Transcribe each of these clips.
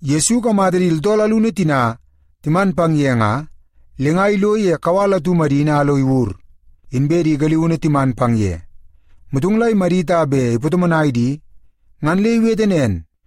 Yesu ikamata di tooltool alunu tina timan pang ye nga, le nga ilo ye kawal atu madini a lo iwur, inbe di galiunu timan pang ye. Motong la imadit a bet ipatomonai di, ngan le iwete nen,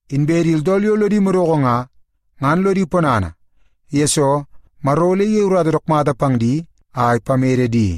Inbe di tooltool yo lodi madoko nga, ngan lodi ponana, yesoo Maro ole iyei urata dook mata pang di a ipamede di.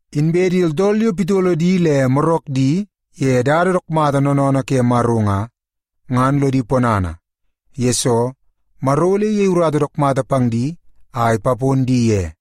Inbe di tooltool yo pitolo di le morak di ye dada dook mata noonoonoo ke Maro nga, ngan lodi ponana, yesoo Maro ole iyei urata dook mata pang di a ipapon di ye.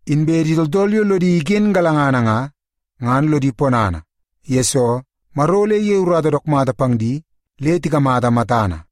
Inbe di tooltool yo lodi iken galangana nga, ngan lodi ponana, yesoo Maro ole iyei urata dook mata pang di le tikamata matana.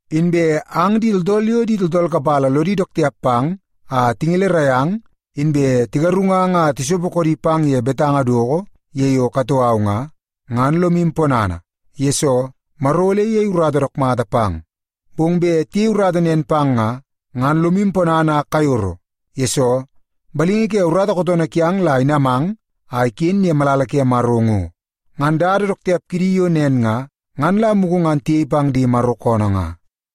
“Inbe ang di tooltool yo di tooltool kapala lodi dook tiap pang a tingelerai ang inbe tigarungang a tisopo koodi pang ye betanga doko ye yo katoo au nga, ngan lomu ponana, yesoo Maro ole iyei dada dook mata pang. Bong bet tiyei urata nen pang nga, ngan lomu ponana a kayoro, yesoo balingi ke urata kootoonoo kiang la inamang a iken ye malala ke Maro ngo. Ngan dada dook tiap kidi yo nen nga, ngan la mugu ngan tiyei pang di Maro koonoo nga.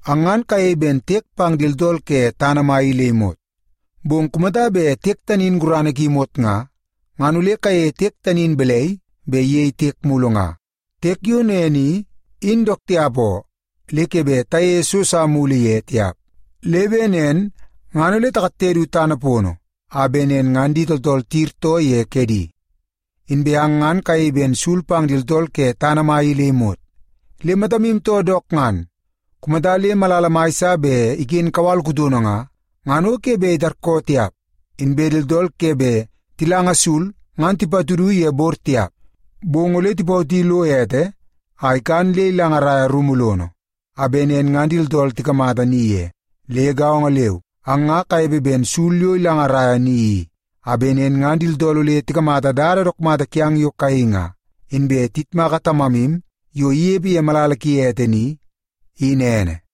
“Ang ngan kayei ben tiek pang di tooltool ke tana mai i le imot. Bong kumata bet tiek tani in gurana ki imot nga, ngan ole kayeie tiek tani in balai bet iyei tiek mulu nga? Tiek yo nen i, in dook tiap oo, le ke bet tayeie so sa mulu ye tiap. Le bet nen ngan takatte du tana pono a bet nen ngan di tooltool tiyirtoo ye kedi. “Inbe ang ngan kayei ben sul pang di tooltool ke tana mai i le imot. Le matamu too dook ngan, kumata le malala mai sa bet iken kawal kutono nga, ngan o ke bet itarkoo tiap. Inbe di tooltool ke bet tilanga sul ngan tipatudu ye bor tiap. Bong ole tipawoti lo ete a ikan le ilangaraia rumu lono, a bet nen ngan di tooltool tikamata ni ye. Le gaongo leu, ang nga kanepe ben sul yo ilangaraia ni i, a bet nen ngan di tooltool ole tikamata dada dook mata kiang yo kayei nga, inbe tiyitmaka Tamamu yo inepe ye malala ki ete ni, in ene.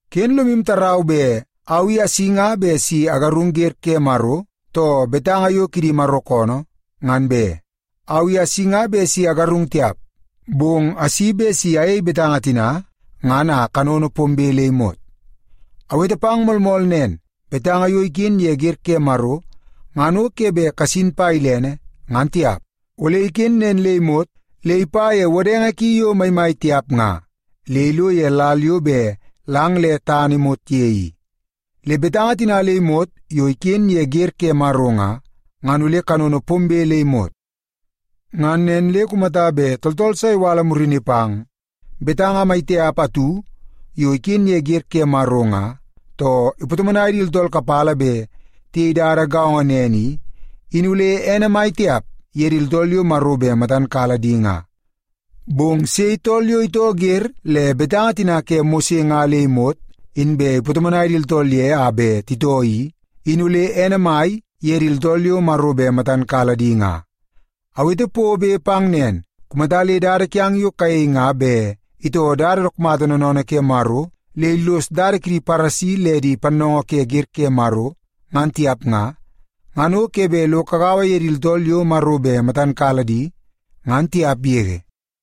“Ken lomu tarau bet au asi nga bet si agarung wer ke Maro too betanga yo kidi Maro koonoo, ngan be. Au i asi nga bet si agarung tiap, bong asi bet si ayei betanga tina ngan a kanono pombe le imot. Awete pang moolmool nen, betanga yo iken ye wer ke Maro ngan o ke bet kasin pa bet ilene, ngan tiap. Ole iken nen le imot le ipa ye wodenge ki yo maimai tiap nga, le ilo ye lal yo bet lang le tana imot ye i. Le betanga tina le imot yo iken ye wer ke Maro nga, ngan ole kanono pombe le imot. Ngan nen le kumata bet tooltool sa iwala murini pang betanga mai tiap atu yo iken ye wer ke Maro nga, too ipatomonai di tooltool kapala bet tiyei dada gaongo nen i, in ole ene mai tiap ye di tooltool yo Maro bet matan kala di nga. Bong sei tool yo itoo wer le betanga tina ke Mose nga le imot, inbe ipatomonai di tooltool ye a bet titoo i, in ole ene mai ye di tooltool yo Maro bet matan kala di nga. Awete pobe pang nen, kumata le dada kiang yo kayei nga bet itoo dada dook mata noonoonoo ke Maro le illos dada kidi Paresi le di pannoongoo ke wer ke Maro, ngan tiap nga, ngan o ke bet lo kagaua ye di tooltool yo Maro bet matan kala di, ngan tiap yege.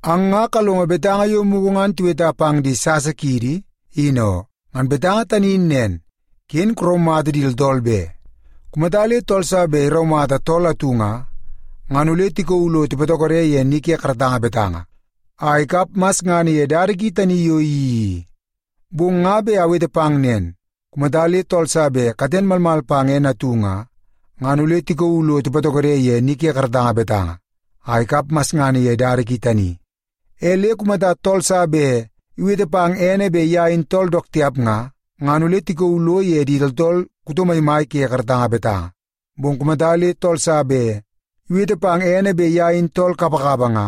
“Ang nga kalongo betanga yo mugu ngan tiweta pang di sasa kiidi, in oo. Ngan betanga tani in nen, ‘Ken karaumata di tooltool be. Kumata le tool sa bet iraumata tool atu nga, ngan ole tikauu lo tipatokode ye ni ke karatanga betanga a ikap masngana ye dada ki tani yo iyeii i.’ Bong nga bet awete pang nen, kumata le tool sa bet katen malmal pang ene atu nga, ngan ole tikauu lo tipatokode ye ni ke karatanga betanga a ikap masngana ye dada ki tani. E le kumata tool sa bet iwete pang ene bet ye in tool dook tiap nga, ngan ole tikauu lo ye di tooltool kuto maimai ke karatanga betanga. Bong kumata le tool sa bet iwete pang ene bet ye in tool kapakapa nga,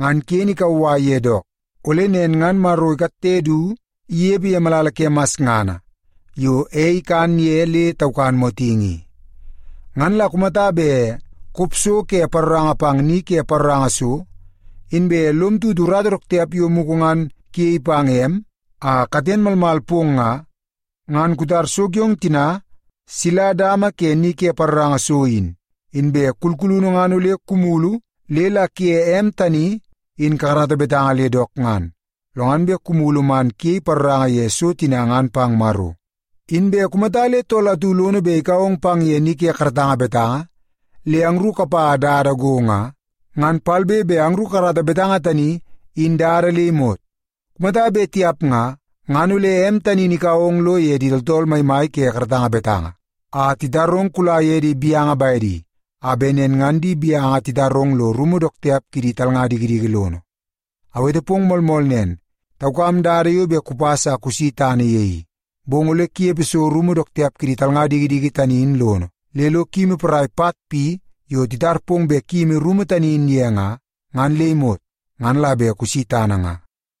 ngan ken ikauwai ye dook, ole nen ngan Maro ikatte du inepe ye malala ke masngana yo ei ikan ye le taukan motingi i. “Ngan la kumata bet kop so ke paroranga pang ni ke paroranga so, inbe lom tutu urata dook tiap yo mugu ngan kuyei pang em a katen malmal pong nga, ngan kutar so kiong tina sila dama ke ni ke paroranga so in. Inbe kulkulunu ngan ole kumulu le la kuye em tani in kakarata betanga le dook ngan, lo ngan bet kumulu man kuyei paroranga ye so tina ngan pang Maro. “Inbe kumata le tool atu lono bet ikau ong pang ye ni ke karatanga betanga le angru kapa dada go nga, ngan palbe be angru kakarata betanga tani in dada le imot. Kumata bet tiap nga, ngan ole em tani in ikau ong lo ye di tooltool maimai ke karatanga betanga a titarong kula ye di gaunu bedi, a bet nen ngan di gaunu titarong lo ye rumu dook tiap kidi talnga dikidiki lono. Awete pong moolmool nen, taukam dada yo bet kupas a kusi tana ye i. Bong ole kunepe so rumu dook tiap kidi talnga dikidiki tani in lono, le lo kuyimi porai pat pi yo titar pong bet kuyimi rumu tani in ye nga, ngan le imot, ngan la bet kusi tana nga.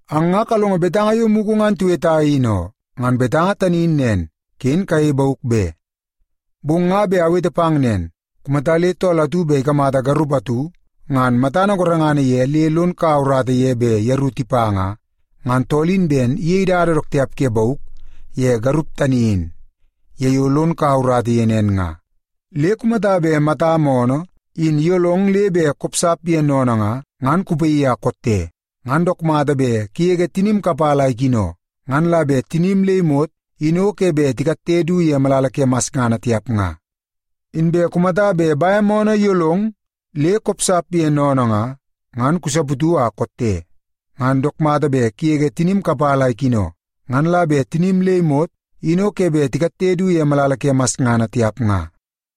“Ang nga kalongo betanga yo mugu ngan tiweta, in oo. Ngan betanga tani in nen, ‘Ken kayei bauk be.’ Bong nga bet awete pang nen, kumata le tool atu bet ikamata garup atu ngan matana gorengana ye le lon kaua urata ye bet yeru tipa nga, ngan tool in ben iyeie dada dook tiap ke bauk ye garup tani in ye yo lon kaua urata ye nen nga. “Le kumata bet matam oonoo in iyolong le bet kopsap ye sennene nga, ngan kupaii a kotte. Ngan dook mata bet kugege tinim kapala a ikino, ngan la bet tinim le imot in o ke bet tikatte du ye malala ke masngana tiap nga. Inbe kumata bet bem oonoo iyolong le kopsap ye sennene nga, ngan kusaputu a kotte. Ngan dook mata bet kugege tinim kapala a ikino, ngan la bet tinim le imot in o ke bet tikatte du ye malala ke masngana tiap nga.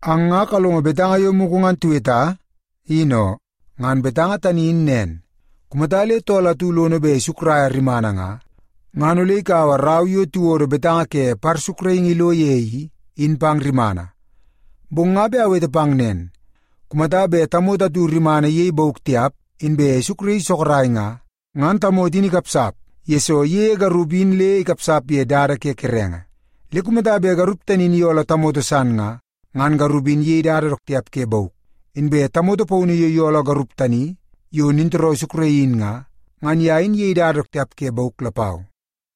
“Ang nga kalongo betanga yo mugu ngan tiweta, in oo. Ngan betanga tani in nen, ‘Kumata le tool atu lono bet isukraia rimana nga, ngan ole ikaua rau yo tiwodo betanga ke parsukraingi ilo ye i, in pang rimana.’ Bong nga bet awete pang nen, kumata bet tamoto atu rimana iyei bauk tiap, inbe isukraii sorok nga, ngan tamoto in ikapsap, yesoo iyeie garup in le ikapsap ye dada ke kerenge. Le kumata bet garup tani in iyooloo tamoto san nga, ngan garup in iyei dada dook tiap ke bauk. Inbe tamoto paunu yo iyooloo garup tani yo nintooroo isukraii in nga, ngan ye in iyei dada dook tiap ke bauk lapau.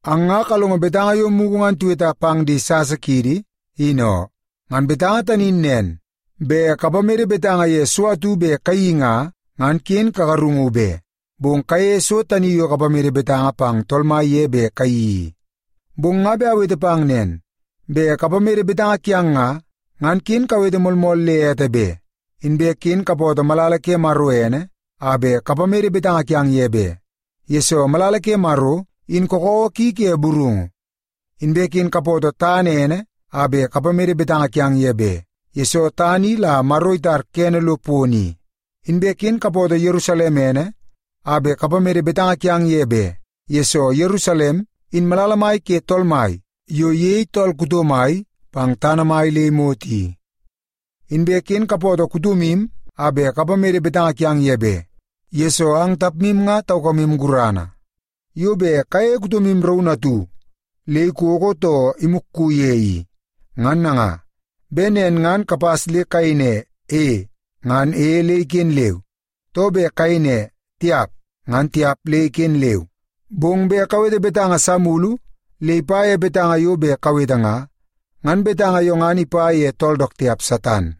“Ang nga kalongo betanga yo mugu ngan tiweta pang di sasa kiidi, in oo. Ngan betanga tani in nen, ‘Bet kapamede betanga ye so atu bet kayeii nga, ngan ken kagarungu be. Bong kayeie so tani yo kapamede betanga pang Tool Mai ye bet ole kayeii i.’ Bong nga bet awete pang nen, bet kapamede betanga kiang nga, ngan ken kawete moolmool le ete be. Inbe ken kapootoo malala ke Maro ene a bet kapamede betanga kiang ye be, yesoo malala ke Maro in kakawa ki ke burungu. Inbe ken kapootoo tana ene a bet kapamede betanga kiang ye be, yesoo tana i la Maro itar kene lo pono i. Inbe ken kapootoo Yerusalem ene a bet kapamede betanga kiang ye be, yesoo Yerusalem in malala mai ke Tool Mai yo iyei tool kuto mai pang tana mai le imot i. Inbe ken kapootoo kutomu a bet kapamede betanga kiang ye be, yesoo ang tapmu nga taukamu gurana yo bet kayeie kutomu raunu atu le ikoko too imukku ye i. Ngan nanga, bet nen ngan kapas le kayei ne, ‘E’ ngan ‘E’ le iken leu, too bet kayei ne, ‘Tiap’ ngan ‘Tiap’ le iken leu. Bong bet kawete betanga san mulu le ipa ye betanga yo bet kawete nga, ngan betanga yo ngan ipa ye tool dook tiap Satan.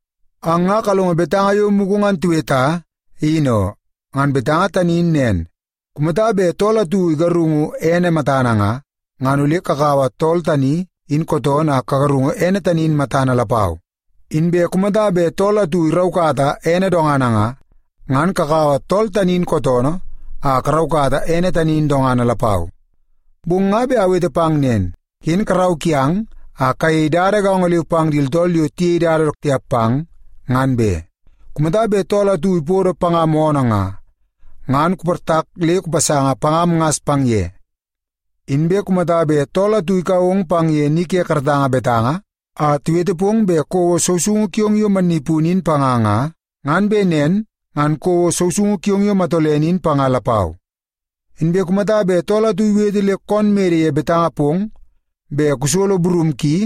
“Ang nga kalongo betanga yo mugu ngan tiweta, in oo. Ngan betanga tani in nen, ‘Kumata bet tool atu igarungu ene matana nga, ngan ole kakaua tool tani in kootoonoo a kagarungu ene tani in matana lapau. Inbe kumata bet tool atu iraukata ene dongana nga, ngan kakaua tool tani in kootoonoo a karaukata ene tani in dongana lapau.’ Bong nga bet awete pang nen, ken karau kiang a kayei dada gaongo leu pang di tooltool yo tiyei dada dook tiap pang, ngan be. Kumata bet tool atu ipodo pangam oonoo nga, ngan kuportak le kupasanga pangam ngas pang ye. Inbe kumata bet tool atu ikau ong pang ye ni ke karatanga betanga a iwete pong bet kouo sousoungu kiong yo mannipunu in panga nga, ngan bet nen ngan kouo sousoungu kiong yo matolene in panga lapau. Inbe kumata bet tool atu iwete le koon mede ye betanga pong bet kusolo burum ki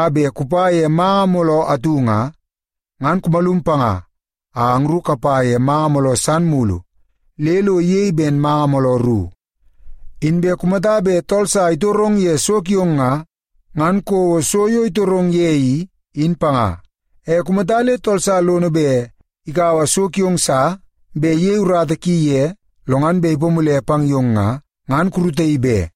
a bet kupa ye manga mooloo atu nga, ngan kumalum panga a angru kapa ye manga mooloo san mulu le lo iyei ben manga mooloo ru. Inbe kumata bet tool sa itorong ye so kiong nga, ngan kouo so yo itorong ye i, in panga. E kumata le tool sa lono bet ikaua so kiong sa bet iyei urata ki ye lo ngan bet ipamule pang yong nga, ngan kurutaii be.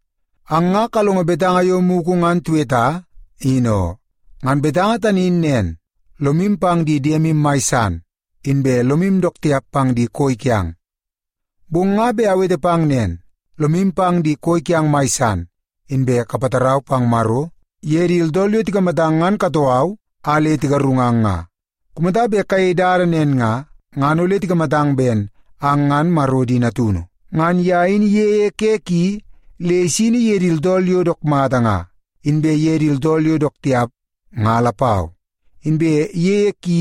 “Ang nga kalongo betanga yo mugu ngan tiweta, in oo. Ngan betanga tani in nen, ‘Lomu pang di diemu mai san, inbe lomu dook tiap pang di koi kiang.’ Bong nga bet awete pang nen, lomu pang di koi kiang mai san, inbe kapatarau pang Maro ye di tooltool yo tikamatang ngan katoo au a le tigarungang nga. Kumata bet kayei dada nen nga, ngan ole tikamatang ben ang ngan Maro di natunu. Ngan ye in iyeie ke ki le isini ye di tooltool yo dook mata nga, inbe ye di tooltool yo dook tiap nga lapau. Inbe iyeie ki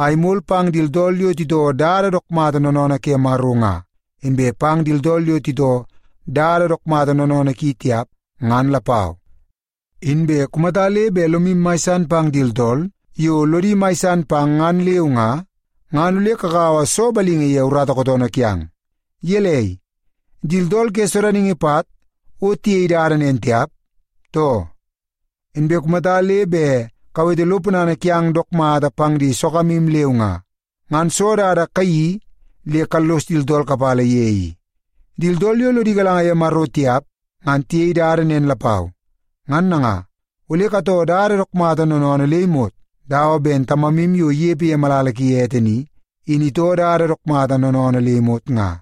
a imol pang di tooltool yo titoo dada dook mata noonoonoo ke Maro nga, inbe pang di tooltool yo titoo dada dook mata noonoonoo ki tiap, ngan lapau. Inbe kumata le bet lomu mai san pang di tooltool yo lodi mai san pang, ngan leu nga, ngan ole kakaua soo balingi ye urata kootoonoo kiang? Gelei, di tooltool ke sodaningi pat o tiyei dada nen tiap, too? Inbe kumata le bet kawete lo ponana kiang dook mata pang di sogamu leu nga, ngan soo dada kayeii le kallos di tooltool kapala ye i? Di tooltool yo lodi galanga ye Maro tiap ngan tiyei dada nen lapau. Ngan nanga, ole katoo dada dook mata noonoonoo le imot, dawa ben Tamamu yo inepe ye malala ki ete ni, in itoo dada dook mata noonoonoo le imot nga.”